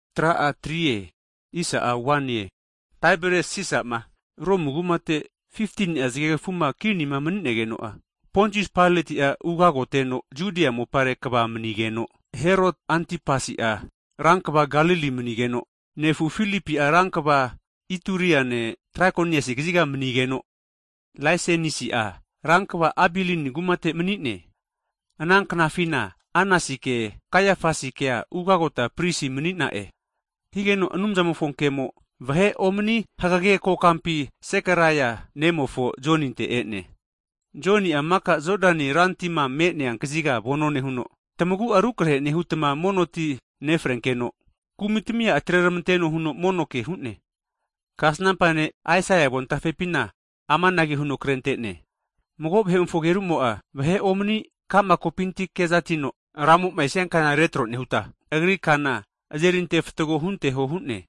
Hagi Taiberias Sisa'ma Romu kumate 15ni'a zage kafuma kinima mani'negeno'a, Pontius Pailoti'a Judia mopare ugagoteno kva mani'geno, Heroti Antipasi'a rankva Galili manigeno, nefu Filipi'a rankva Ituriane, Trakoniasi kaziga mani'geno, Laiseniasi'a rankva Abilini kumate mani'ne. Ana knafina Anasike, Kaiafasikea mono nonte ugagota pristi netre mani'na'e. Higeno Anumzamofo kemo, vahe omani hagege kokampi Zekaraia nemofo Joninte e'ne. Joni'a mika Jodani rantima me'nea kaziga vano nehuno, tamagu'a rukrahe nehutma mono ti nefrenkeno, kumi tamia atreramanteno huno mono ke hu'ne. Kasnampa ne' Aisaia avontafepina amanage huno krente'ne, Mago vahe'mofo agerumo'a, vahe omani ka'ma kopinti kezatino, Ramo'ma esia kana retro nehuta, Agri kana azeri ante fatgo hunteho hu'ne.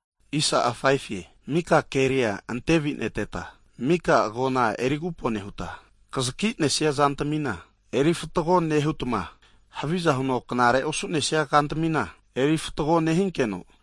Mika keri'a antevineteta, mika agona eri agupo nehutma, kazaki nesia zantamina eri fatgo nehutma, haviza huno knare osu'nesia kantamina erintefatgo, nehinkeno,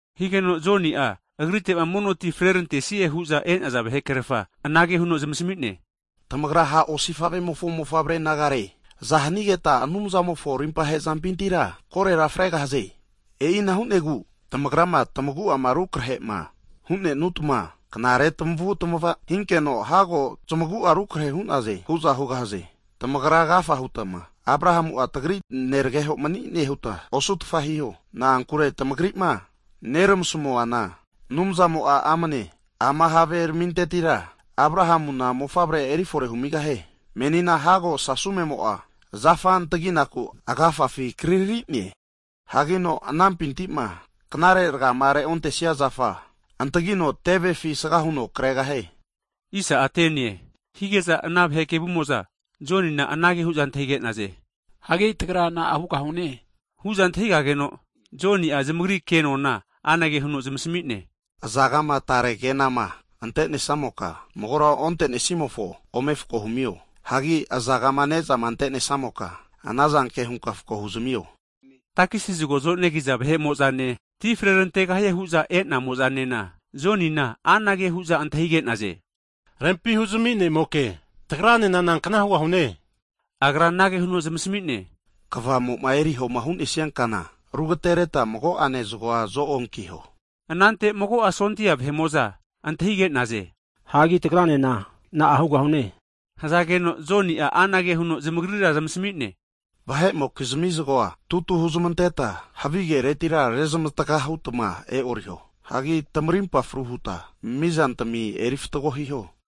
Higeno Joni'a agrite'ma mono ti frerantesie hu'za e'naza vahe krerfamo'za anage huno zamasami'ne, Tamagra ha' osifave'mofo mofavre nagare! Aza hanigetma Anumzamofo rimpa hezampintira korera fregahaze? E'ina hu'negu, tamagrama tamagu'ama rukrehema hu'nenutma knare tamavutmava hinkeno hago zamagu'a rukrehe hu'naze hu'za hugahaze. Tamagra agafa hutma Abrahamu'a tagri nerageho mani'ne huta osutfa hiho. Na'ankure tamagri'ma neramasmuana, Anumzamo'a amne ama haveramintetira Abrahamuna mofavrea erifore humigahie. Menina hago sasumemo'a zafa antaginaku agafafi kriri'ne, hagino anampinti'ma knare ragama reontesia zafa antagino tevefi asaga huno kregahie. Hige'za ana vahe kevumo'za Jonina anage hu'za antahige'naze. Hagi tagra na'a hugahu'ne? Hu'za antahigageno, Joni'a, zamagari kenona anage huno zamasmi'ne, azagama tare kenama ante'nesamoka, magora onte'nesimofo ome fako humio, hagi azagama ne'zama ante'nesamoka, anazanke hunka fako huzamio. Takisi zagoma zonegiza vahe'mo'zane, ti frerantegahie hu'za e'namo'zanena, Jonina anage hu'za antahige'naze. Rempi huzami nemoke, tagranena nankna hugahune? Agra anage huno zamasmi'ne, Kvamo'ma eriho hu'nesia kana arugateretma mago'ene zagoa zo'onkiho. Anante mago'a sondia vahe'mo'za antahige'naze. Hagi tagaranena na'a hugahune? Hazageno Joni'a anage huno zamagrira zamasmi'ne, Vahe'mokizami zagoa tutu huzamanteta havigea hutma e'oriho. Hagi tamarimpa fru hutma mizantami eri fatgo hiho.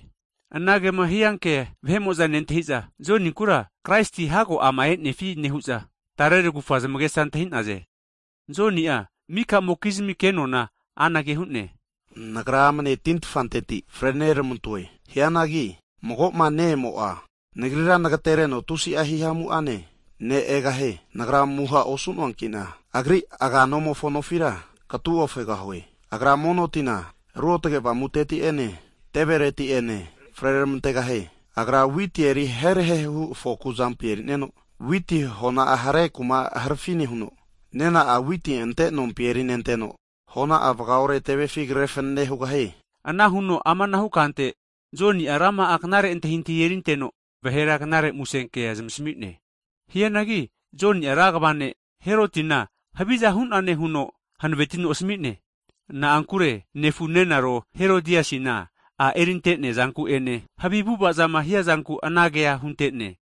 Anagema hianke vahe'mo'za nentahi'za, Joninkura Kraisi hago ama e'nefi nehu'za, tare tagufa zamagesa antahi'naze. Joni'a mika'mokizmi kenona anage hu'ne, Nagra amane tintafanteti fre'neramantoe. Hianagi magoma ne'emo'a nagrira nagatereno tusi hihamu'ane ne' egahie. Nagra amuha osu'noankina Agri aganomofo nofira katu ofegahue. Agra mono tina Ruotage Avamuteti'ene, tevereti'ene freramantegahie. Agra witi eri herahehu fokua azampi eri'no, witi hona'a hare kuma harafi nehuno, nena'a witi ante nompi eri'nenteno, hona'a vaga ore tevefi kre fanene hugahie. Ana huno amanahu kante, Joni'a rama'a knare antahintahi erinteno, vahera Knare Musenkea zamasami'ne. Hianagi Joni'a rankva ne' Herotina haviza hu'nane huno hanavetino asami'ne, na'ankure nefu nenaro rehanereno Herodiasina a' erinte'nea zanku'ene, havi avu'avazama hiazanku anagea hunte'ne.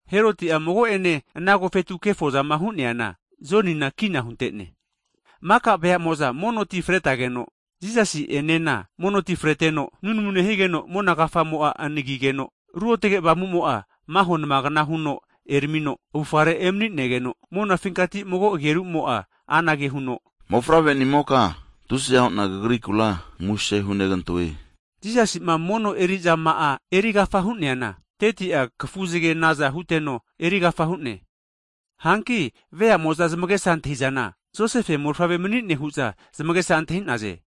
Heroti'a mago'ene ana agofetu kefozama hu'neana, Jonina kina hunte'ne. Maka veamo'za mono ti fretageno, Jisasi'enena mono ti freteno, nunamu nehigeno mona kafamo'a anagigeno, Ruotage Avamumo'a maho namagna huno eramino avufare emanigeno, monafinkati mago agerumo'a anage hu'ne, Mofavrenimoka tusiza hu'na Kagrikura kavesinegante'na muse hunegantoe. Jisasi'ma mono eri'zama'ama erigafa hu'neana, 30'a kafuzage naza huteno erigafa hu'ne. Hanki vea'mo'za zamagesa antahi'zana, Josefe mofavre mani'ne, hu'za zamagesa antahi'naze.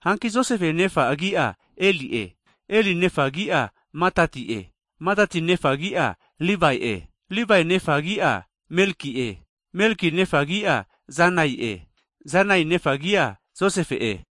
Hanki Josefe nefa agi'a Eli'e. Eli nefa agi'a Matati'e. Matati nefa agi'a Livae'e. Livae nefa agi'a Melki'e. Melki nefa agi'a Janai'e. Janai nefa agi'a Josefe'e.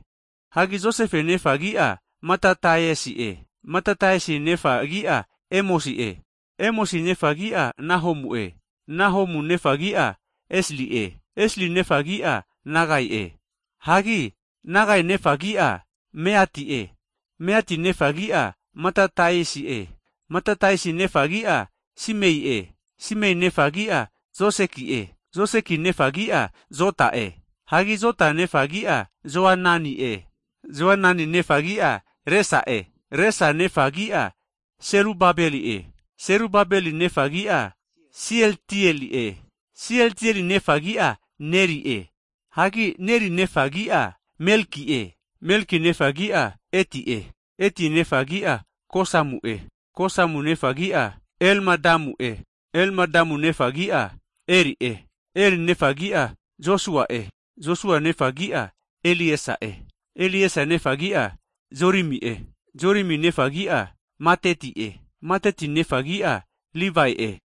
Hagi Josefe nefa agi'a Matataiasi'e. Matataiasi nefa agi'a Emosi'e. Emosi nefa agi'a Nahomu'e. Nahomu nefa agi'a Esli'e. Esli nefa agi'a Nagai'e. Hagi Nagai nefa agi'a Mati'e. Mati nefa agi'a Matataiasi'e. Matataiasi nefa agi'a Simei'e. Simei nefa agi'a Joseki'e. Joseki nefa agi'a Jota'e. Hagi Jota nefa agi'a Joanani'e. Joanani nefa agi'a Resa'e. Resa nefa agi'a Selubabeli'e. Selubabeli nefa agi'a Sieltieli'e. Sieltieli nefa agi'a Neri'e. Hagi Neri nefa agi'a Melki'e. Melki nefa agi'a Ati'e. Ati nefa agi'a Kosamu'e. Kosamu nefa agi'a Elmadamu'e. Elmadamu nefa agi'a Er'e. Er nefa agi'a Josua'e. Josua nefa agi'a Eliesa'e. Eliesa nefa agi'a Jorimi'e. Jorimi nefa agi'a Matati'e. Matati nefa agi'a Livae'e.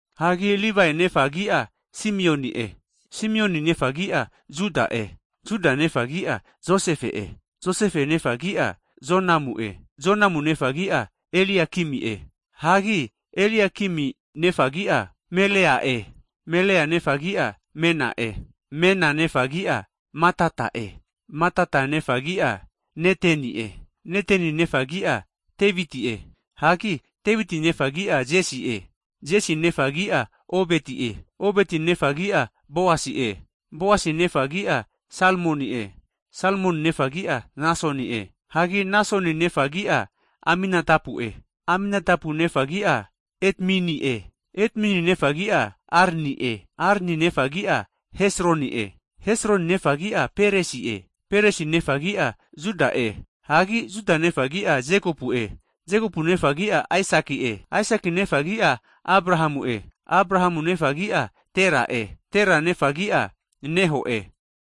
Hagi Livae nefa agi'a Simioni'e. Simioni nefa agi'a Juda'e. Juda nefa agi'a Josefe'e. Josefe nefa agi'a Jonamu'e. Jonamu nefa agi'a Eliakimi'e. Hagi Eliakimi nefa agi'a Melea'e. Melea nefa agi'a Mena'e. Mena nefa agi'a Matata'e. Matata nefa agi'a Neteni'e. Neteni nefa agi'a Deviti'e. Hagi Deviti nefa agi'a Jesi'e. Jesi nefa agi'a Obeti'e. Obeti nefa agi'a Boasi'e. Boasi nefa agi'a Salmoni'e. Salmoni nefa' agi'a Nasoni'e. Hagi Nasoni nefa agi'a Aminatabu'e. Aminatabu nefa agi'a Edmini'e. Edmini nefa agi'a Arni'e. Arni nefa agi'a Hesroni'e. Hesroni nefa agi'a Peresi'e. Peresi nefa agi'a Juda'e. Hagi Juda nefa agi'a Jekopu'e. Jekopu nefa agi'a Aisaki'e. Aisaki nefa agi'a Abrahamu'e. Abrahamu nefa agi'a Tera'e. Tera nefa agi'a Nahori'e.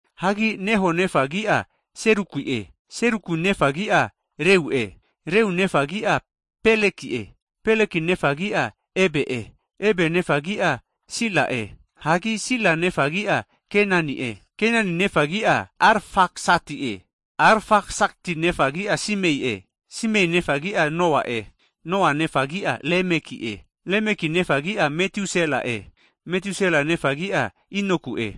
Hagi Nahori nefa agi'a Seruki'e. Seruki nefa agi'a Reu'e. Reu nefa agi'a Peleki'e. Peleki nefa agi'a Eberi'e. Eberi nefa agi'a Sela'e. Hagi Sela nefa agi'a Kenani'e. Kanani nefa agi'a Arfaksati'e. Arfaksati nefa agi'a Semi'e. Semi nefa agi'a Noa'e. Noa nefa agi'a Lemeki'e. Lemeki nefa agi'a Metusela'e. Metusela nefa agi'a Inoku'e.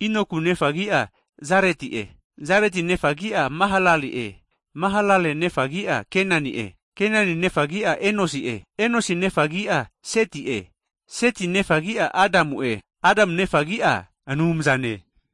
Inoku nefa agi'a Jareti'e. Jareti nefa agi'a Mahalale'e. Mahalale nefa agi'a Kenani'e. Kenani nefa agi'a Enosi'e. Enosi nefa agi'a Seti'e. Seti nefa agi'a Adamu'e. Adamu nefa agi'a Anumzane.